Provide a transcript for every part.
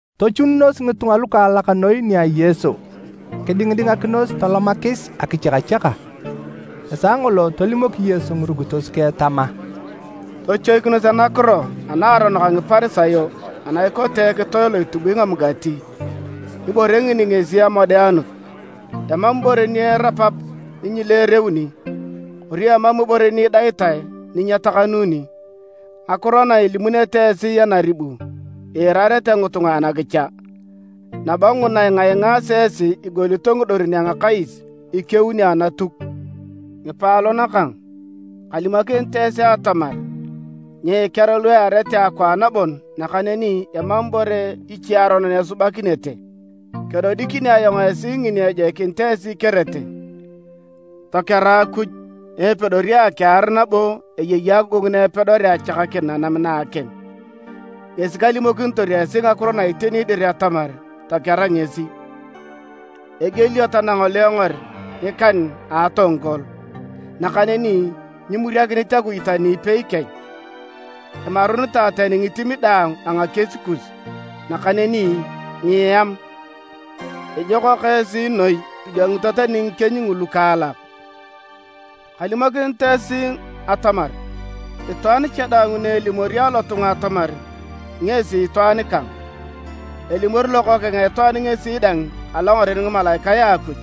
Tochununos ngitunga lukaalak noi nia Yesu kidingidingakinos tolomakis akichakachaka. Esaa ngolo tolimok Yesu ngirukitos keng tama, “Tochoikinos anakiro a naaronok a Ngiparisayo ana ikote ekitoe lo itubui ngamugati, Ibore ngini ngesi amodeanut. Emam ibore ni erapap ni nyileereuni, kori emam ibore ni idaitae ni nyetakanuni. Ngakiro na ilimunete esi anaribu iirarete ngitunga anakicha, nabo nguna ingaingaasi esi igolito ngidorin a ngakais, ikeunio Anatuk. “Ngipaalon kang, kalimokinit esi atamar nyiikear lu earete akwaan bon nakaneni emam ibore iche aronon esubakinete. Kedodikini ayong esi ngini ejoikinit esi ikerete, tokera Akuj na epedori akiar nabo eyei agogongu na epedorea achakakin nanam na a akim. Ngesi kalimokinitor esi ngakiro na iteni dir atamar tokera ngesi! “Egielio tanangolengor ngikan a atongkol. Nakaneni nyimuriakinit Akuj tani ipei kech. Imarunitae tani ngitim daang a ngakies kus. Nakaneni nyieam. Ijokak esi noi idwangito tani ngikieny ngulu lukaalak! “Kalimokinit esi atamar, itwaan cha daang ni elimor alotunga atamar ngesi itwaan kang, elimori Lokookeng a Itwaan ngesi dang alongaren ngimalaikae a Akuj,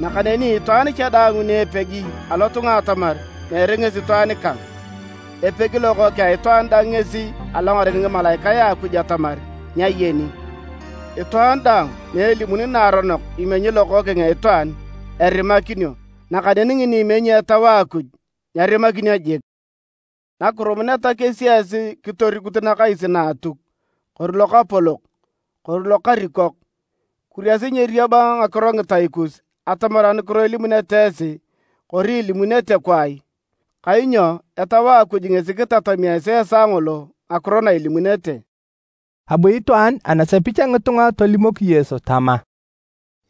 nakaneni itwaan cha daang ni epegi alotunga atamar meere ngesi itwaan kang, epegi Lokookeng a Itwaan dang ngesi alongaren ngimalaikae a Akuj atamar nyayeni. “Itwaan daang ni elimuni naaronok imenyi Lokookeng a Itwaan, erimakinio, nakaneni ngini imenyi Etau a Akuj nyerimakinio jik. “Nakirumuneta kesi esi kitorikut nakais na Atuk, kori lokapolok, kori lokarikok, kuriasi nyeeriab ngakiro ngitai kus atamar anukiro ilimunete esi kori ilimunete kwaai. Kainyo Etau a Akuj ngesi kitatami esi esaa ngolo ngakiro na ilimunete.” Abu itwaan anasepich a ngitunga tolimok Yesu tama,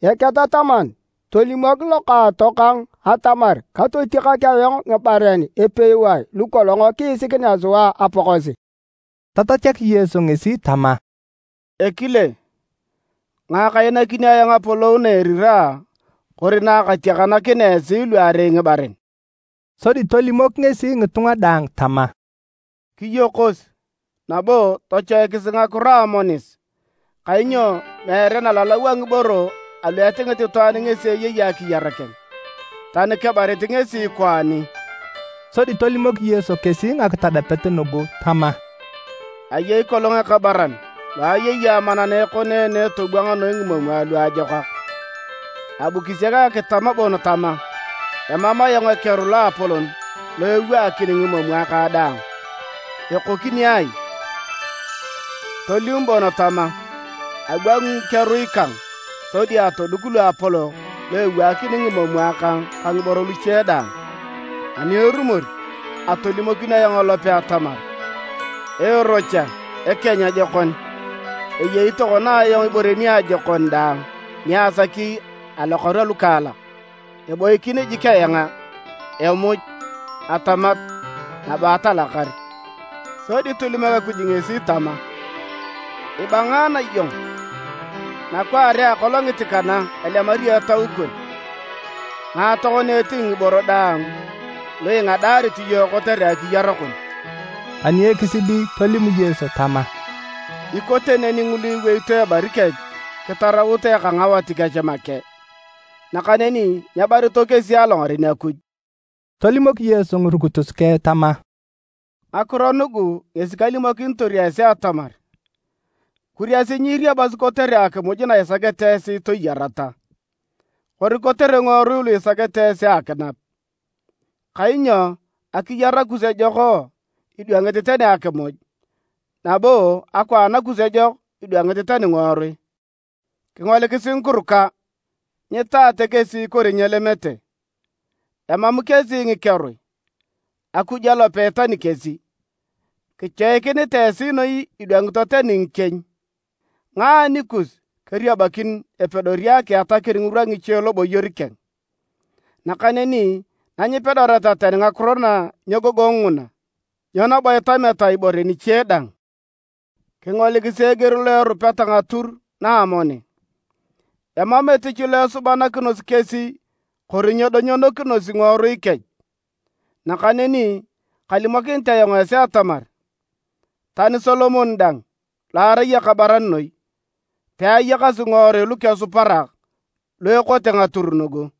“Eketataman tolimok lokaatokang atamar katotiakak ayong ngibaren epewae lukolong kiisikinea sua apakosi.” Tatachak Yesu ngesi tama, “Ekile, ngae kainakini ayong apolou na eriraa kori na katiakanakinea esi luarei ngibaren?” Sodi tolimok ngesi ngitunga daang tama, “Kiyokos, nabo tochoikisi ngakiro a amonis, kainyo meere nalalau a ngiboro alu etingit itwaan ngesi eyei akiyar keng, tani kebarit ngesi kwaani.” Sodi tolimok Yesu kesi ngakitadapet nugu tama: “Ayei kolong ekabaran lo ayei amana na ekoneene tobwang noi ngimomwa luajokak. Abu kisiak akitam bon tama, ‘Emam ayong ekeru loapolon lo ewaakini ngimomwa kang daang. Ekokini ai?’ Tolim bon tama, ‘Abwangi ngikerui kang sodi atoduk luapolok lu ewaakini ngimomwa kang ka ngiboro luche daang. Ani erumor, atolimokin ayong elope atamar, Ee rocha ekeny ajokon! Eyei tokona ayong ibore niajokon daang ni asaki alokaru alukaalak. Eboikin jik eanga, emuj, atamat, nabo atalakar!’ Sodi tolimok Akuj ngesi tama, ‘Ibangaana iyong! Nakwaare a akolongit kana elemario etau kon, ngae tokona etingi ngiboro daang lu ingadaarit iyong kotere akiyar kon?’” Ani ekisidi tolim Yesu tama, “Ikote neni ngulu iweito ebari kech kitaraut eka ngawat kech make, nakaneni nyebarito kesi alongaren Akuj.” Tolimok Yesu ngirukitos keng tama, “Ngakiro nugu ngesi kalimokinitor esi atamar, kuriasi nyiiriabasi kotere akimuj na isakete esi toyareta, kori kotere ngiworui lu isakete esi akinap. Kainyo akiyar kus ejok idwangit tani akimuj, nabo akwaan kus ejok idwangit tani ngiworui. Kingolikisi ngikuruka: nyitaate kesi kori nyelemete, emam kesi ngikerui, Akuj alope itani kesi! Kichoikinitae esi noi idwangito tani ngikieny! Ngae anikus keriabakin epedori akiatakin ngirwa ngiche loboyor keng? Nakaneni na nyipedoreta tani ngakiro na nyegogong nguna, nyo nabo itameta ibore niche dang? Kingolikisi eger lo erupeta ngatur na amoni: emam etich lo esubanakinosi kesi kori nyedonyonokinosi ngiworui kech. Nakaneni kalimokinit ayong esi atamar, tani Solomon dang, lo arai ekabaran noi, peayakasi ngiworui lukesuparak lu ekote ngatur nugu.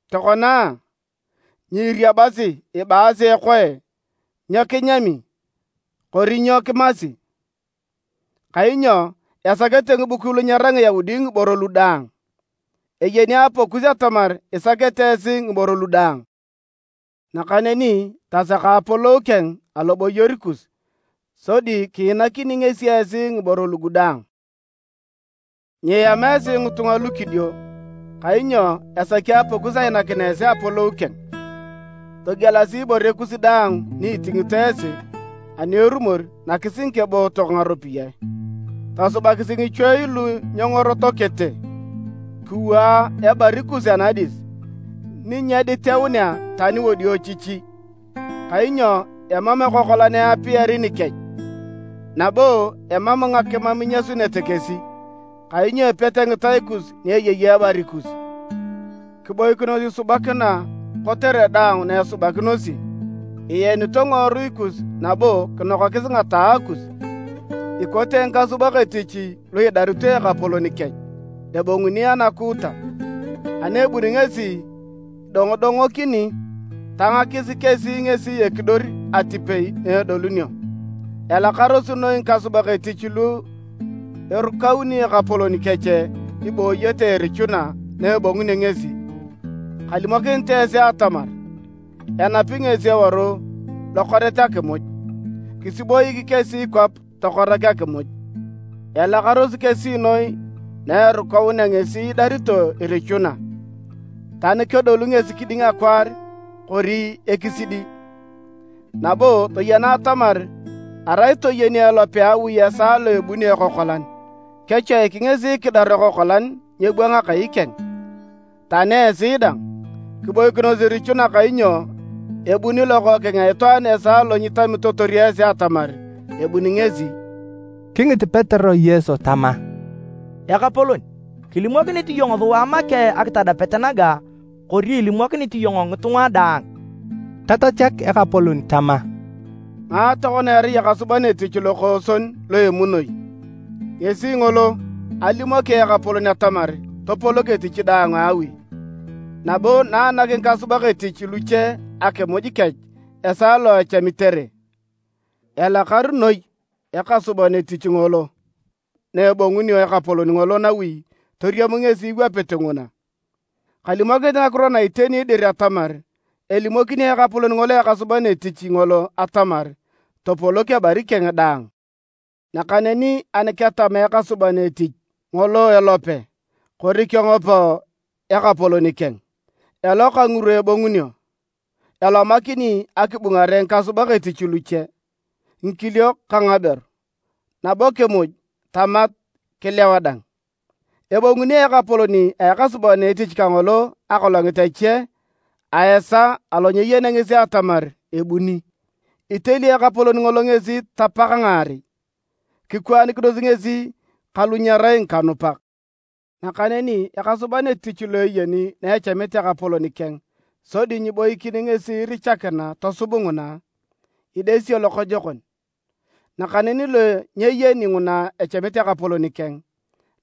“Tokona, nyiiriabasi ibaasi ekoe nyo kinyami kori nyo kimasi. ( Kainyo esakete ngibukui lu nyerai Ngiyaudi ngiboro lu daang). Eyeni Apakus atamar isakete esi ngiboro lugu daang. Nakaneni tasaka apolou keng aloboyor kus, sodi kiinakini ngesi esi ngiboro lugu daang. “Nyieam esi ngitunga lukidio! Kainyo esaki Apakus ainakin esi Apolou keng. Togielasi ibore kus daang ni itingito esi, ani erumor nakis ngikebootok ngaropiyae. Tosubakisi ngichuei lu nyengorotokete. Kiwaa ebari kus anadis, ni nyediteunea tani wadiochichi, kainyo emam ekokolan eapiari nikech, nabo emam ngakimam inyasunete kesi. Kainyo epete ngitai kus ni eyei ebari kus. “Kiboikinos isubakina kotere daang na esubakinosi, ienito ngiworui kus nabo kinokakis ngataae kus, ikote ngikasubak etich lu idarito ekapolon kech, ebonguni anakuuta. Ani ebuni ngesi idongodongokini, tangakis kesi ngesi ekidor atipei na edolunio. Elakarosi noi ngikasubak etich lu erukauni ekapolon kech ibooyete irichuna na ebongunio ngesi! Kalimokinit esi atamar, enapi ngesi eworu lokoret akimuj, kisiboik kesi kwap tokorak akimuj. Elakarosi kesi noi na erukaunea ngesi idarito irichuna, tani kedolu ngesi kiding akwaar kori ekisidi! Nabo toyena atamar arai toyeni elope a awi esaa lo ebunio ekokolan, kechoiki ngesi kidaru ekokolan nyeebwang akai keng. Tani esi dang, kiboikinos irichuna kainyo ebuni Lokookeng a Itwaan esaa lo nyitamitotor esi atamar ebuni ngesi.” Kingit Petero Yesu tama, “Ekapolon, kilimokinit iyong sua make akitadapet naga kori ilimokinit iyong ngitunga daang?” Tatachak Ekapolon tama, “Ngae tokona erai ekasuban etich lokooson lo emunoi? Ngesi ngolo alimoki ekapolon atamar topolok etich daang a awi, nabo nanak ngikasubak etich luche akimuj kech esaa lo echamitere. Elakar noi ekasuban etich ngolo na ebongunio ekapolon ngolo nawi toriam ngesi iwapit nguna! Kalimokinit ngakiro na iteni dir atamar elimokini ekapolon ngolo ekasuban etich ngolo atamar topolok ebari keng daang. Nakaneni ani ketama ekasuban etich ngolo elope kori kengop ekapolon keng, eloka ngirwa ebongunio, elomakini akibungare ngikasubak etich luche, ngikiliok ka ngaberu, nabo kimuj, tamat, kilewa dang. Ebonguni ekapolon a ekasuban etich kangolo akolongit ache a esaa alo nyeyenea ngesi atamar ebuni. Iteli ekapolon ngolo ngesi tapak ngaarei, kikwaanikinos ngesi ka lu nyerai ngikanupak. “Nakaneni ekasuban etich lo eyeni na echamit ekapolon keng sodi nyiiboikin ngesi irichakina tosub nguna, idesio lokojokon. Nakaneni lo nyeyeni nguna echamit ekapolon keng,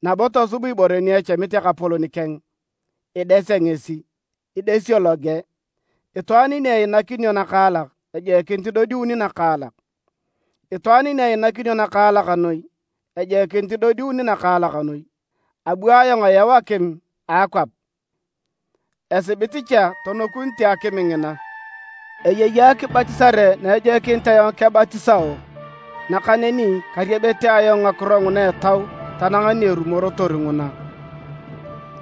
nabo tosub ibore ni echamit ekapolon keng idesea ngesi, idesio loge. Itwaan ni einakinio nakaalak ejoikinit idodiuni nakaalak, itwaan ni einakinio nakaalak noi, ejoikinit idodiuni nakaalak noi. “Abu ayong ayau akim akwap, esibit cha tonokunite akim ngina! Eyei akibatisare na ejoikinit ayong kebatisao, nakaneni kariabete ayong ngakiro nguna etau tanang ni erumorotor nguna!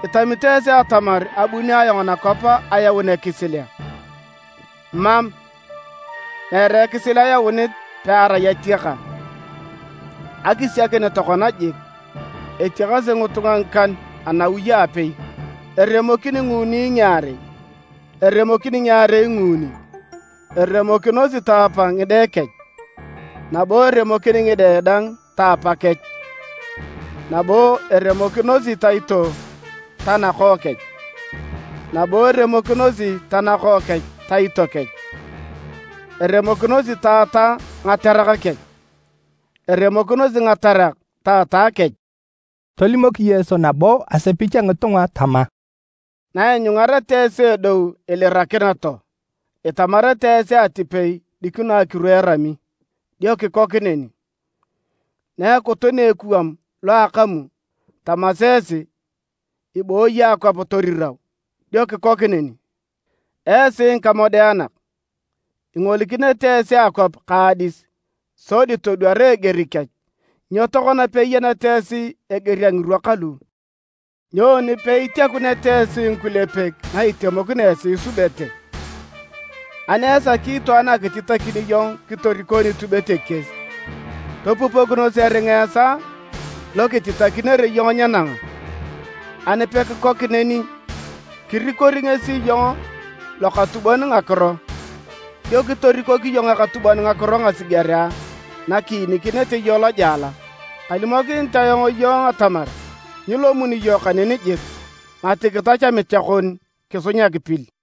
Itamito esi atamar abuni ayong nakwap ayaun ekisil a? Mam, meere ekisil ayaunit pearai atiaka. Akisiakin tokona jik, etiakasi ngitunga ngikan anawi a apei, eremokin nguuni ngiarei, eremokin ngiarei nguuni. Eremokinosi taapa ngide kech, nabo eremokin ngide dang taapakech, nabo eremokinosi taito tanakookech, nabo eremokinosi tanakookech taito kech, eremokinosi taata ngaterak kech, eremokinosi ngaterak taata kech.” Tolimok Yesu nabo asepich a ngitunga tama, “Naianyungareta esi edou ilirakin too, itamarete esi atipei dikino akiru erami, dio kikok neni. Na ekutunea ekuwam lo akamu, tamasi esi, ibooyi akwap torirau, dio kikok neni. Esi ngikamodeanak! Ingolikinete esi akwap ka adis, sodi todwara eger kech, nyo tokona peiyeneta esi eger a ngirwa kalu? “Nyoni peitiakuneta esi ngikulepek na itemokino esi isubete? Ani esaki itwaan akititakin iyong kitoriko nitubet ekies, topupokinos eringa esaa lo kititakinere iyong nyenanga. Ani pekikok neni, kirikori ngesi iyong lokatubon ngakiro, dio kitorikok iyong ekatubon ngakiro ngasigerea nakiinikinete iyong lojela. Kalimokinit ayong iyong atamar nyilomuni iyong kaneni jik, mati kitach amicha kon kisunyak pil.”